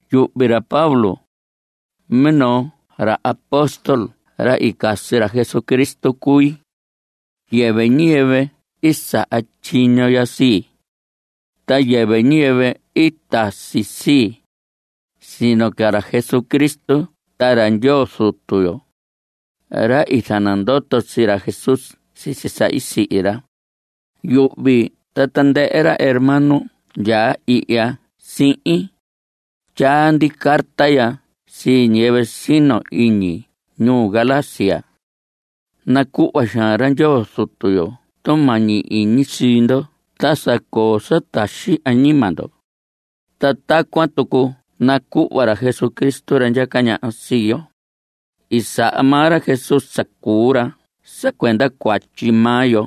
Yuhvi ra Pablo, minoo ra apóstol ra i casi ra Jesucristo cui. Yɨvɨ ñiyɨvɨ i saha tyiño ya sii, ta yɨvɨ ñiyɨvɨ i tasi sii, sino ca ra Jesucristo ta ra Ndyoo Zutu yo, ra i zanandoto sii ra Jesús sisi sa i sihi ra. Yuhvi ta tandɨhɨ ra hermano ndyaa ihya sihin, tyaa ndi carta ya sii ñiyɨvɨ sino iñi ñuu Galacia. Nacuhva xaan ra Ndyoo Zutu yo tumañi iñi sii ndo ta sa coo sa taxi añima ndo, ta tacuan tucu nacuhva ra Jesucristo, ra ndyaca ñaha sii yo. I saha maa ra Jesús sa cuu ra sa cuenda cuatyi maa yo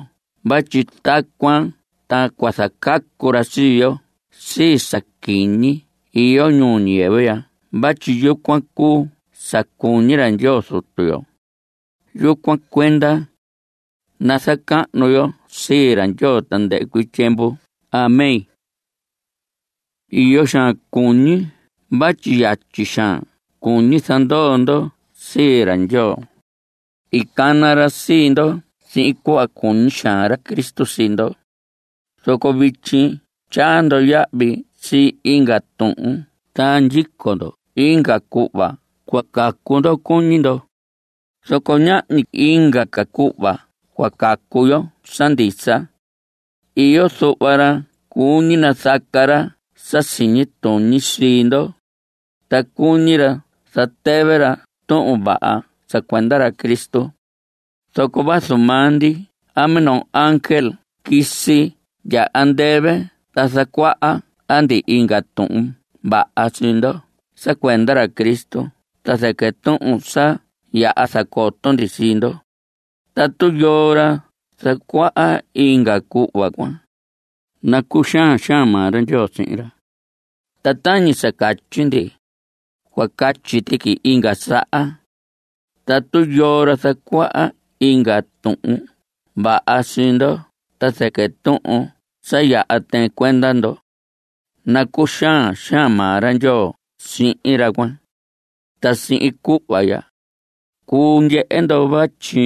vatyi tacuan ta cua zacacu ra sii yo sii sa quiñi iyo ñuu ñiyɨvɨ ya vatyi yucuan cuu sa cuñi ra Ndyoo Zutu yo. Yucuan cuenda ¡nazacahnu yo sii ra Ndyoo tandɨhɨ cuii tyiemvu! Amén. Iyo xaan cuñi vatyi yatyi xaan cuñi zanandoo ndo sii ra Ndyoo. I cana ra sii ndo sihin cuhva cuñi xaan ra Cristo sii ndo, zoco vityi tyaa ndo yahvi sii inga tuhun ta ndyico ndo inga cuhva cua cacu ndo cuñi ndo. Zoco ñahñi inga ca cuhva cua cacu yo sa ndisa. Iyo zuhva ra cuñi nazaca ra sa siñi tuñi sii ndo, ta cuñi ra zatɨvɨ ra Tuhun Vaha sa cuenda ra Cristo. Zoco vazu maa ndi a minoo ángel quisi ndya andɨvɨ ta zacuaha ndi inga Tuhun Vaha sii ndo sa cuenda ra Cristo ta zɨquɨ tuhun sa yaha zacoto ndi sii ndo, tatu yoo ra zacuaha inga cuhva cuan, nacuxaan xaan maa ra Ndyoo sihin ra. Ta tañi sa catyi, cua catyi tuqui inga saha. Tatu yoo ra zacuaha inga Tuhun Vaha sii ndo ta zɨquɨ tuhun sa yaha tɨɨn cuenda ndo, nacuxaan xaan maa ra Ndyoo sihin ra cuan. Ta sihin cuhva ya, cuu ndyehe ndo vatyi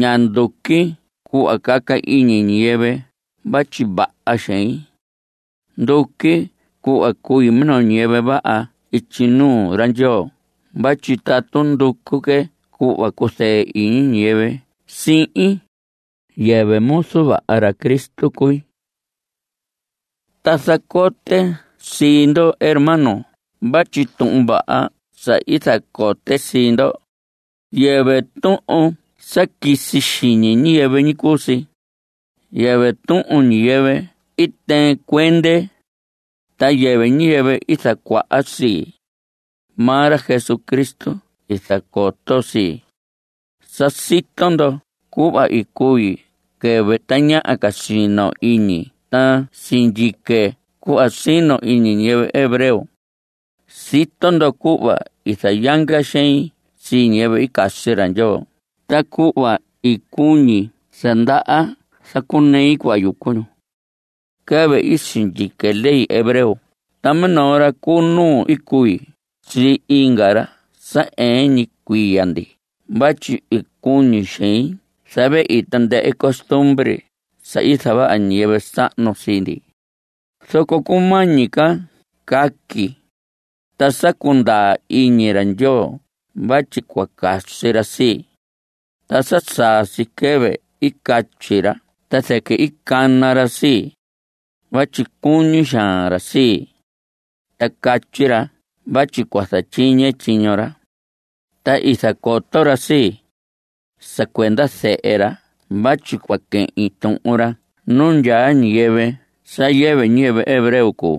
ña nduqui cuhva caca iñi ñiyɨvɨ vatyi vaha xein. Nduqui cuhva cui minoo ñiyɨvɨ vaha ityi nuu ra Ndyoo vatyi tatu nducu que cuhva cuzɨɨ iñi ñiyɨvɨ sihin, yɨvɨ muzu vaha ra Cristo cui. Ta zacote sii ndo hermanos vatyi tuhun vaha sa i zacote sii ndo, yɨvɨ tuhun sa quisi xiñi ñiyɨvɨ ñi cuu si. Yɨvɨ tuhun ñiyɨvɨ i tɨɨn cuende, ta yɨvɨ ñiyɨvɨ i zacuaha sii. Maa ra Jesucristo i zacoto sii. Sa sito ndo cuhva i cui quɨvɨ tañaha ca sino iñi ta sindyique cuhva sino iñi ñiyɨvɨ hebreo. Sito ndo cuhva i zayanga xein sii ñiyɨvɨ i casi ra Ndyoo ta cuhva i cuñi sa ndaha zacunei cuhva yucu ñu. Quɨvɨ i sindyique ley hebreo ta minoo ra cu nuu i cui sii inga ra sa ɨɨn ñi cuiya ndi vatyi i cuñi xein zavehi tandɨhɨ costumbre sa i zavaha ñiyɨvɨ sahnu sii ndi. Zoco cumañi ca càquì, ta sa cundaa iñi ra Ndyoo vatyi cua casi ra sii. Ta sa saa si quɨvɨ i catyi ra ta zɨquɨ i cana ra sii, vatyi cuñi xaan ra sii. Ta catyi ra vatyi cua zatyiñe tyiño ra. Ta i zacoto ra sii, sa cuenda Zehe ra vatyi cua quehin tuhun ra nu ndyaa ñiyɨvɨ sa yɨvɨ ñiyɨvɨ hebreo cuu.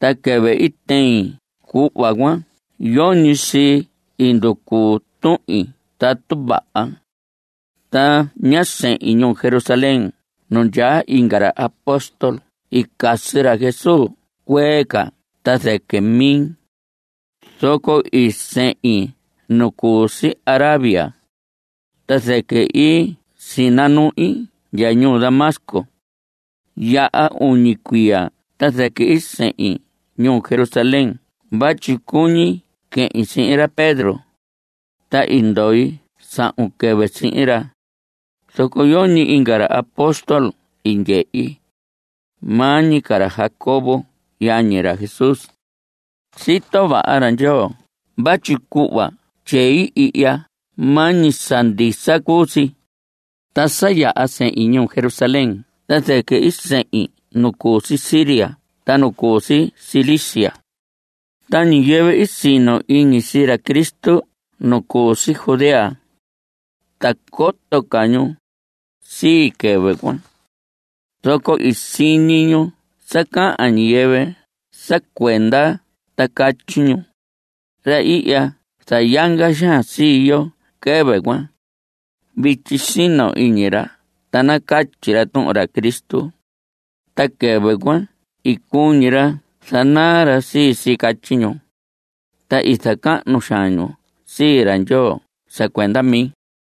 Ta quɨvɨ i tehin cuhva cuan yoñi sii i nducu tuhin tatu vaha. Ta ñá sehin ñuu Jerusalén nu ndyaa inga ra apóstol i casi ra Jesús cuee ca ta zɨquɨ mi. Zoco i sehin nu cu si Arabia, ta zɨquɨ i sinanuhin ndya ñuu Damasco. I yaha uñi cuiya ta zɨquɨ i sehin ñuu Jerusalén vatyi cuñi quehin sihin ra Pedro. Ta i ndoi sahun quɨvɨ sihin ra. Zoco yoñi inga ra apóstol i ndyehi, maa ñi ca ra Jacobo yañi ra Jesús. Sito vaha ra Ndyoo vatyi cuhva tyei ihya maa ñi sa ndisa cuu si. Ta sa yaha sehin ñuu Jerusalén ta zɨquɨ i sehin nu cu si Siria ta nu cu si Cilicia. Ta ñiyɨvɨ sino iñi sii ra Cristo nu cu si Judea, ta coto ca ñu sii, quɨvɨ cuan. Zoco i siñi ñu sa cahan ñiyɨvɨ sa cuende ta catyi ñu: “Ra i zayanga xaan sii yo quɨvɨ cuan, vityi sino iñi ra ta nacatyi ra tuhun ra Cristo. Ta quɨvɨ cuan i cuñi ra zanaa ra sii si.” Catyi ñu. Ta i zacahnu xaan ñu sii ra Ndyoo sa cuenda mi.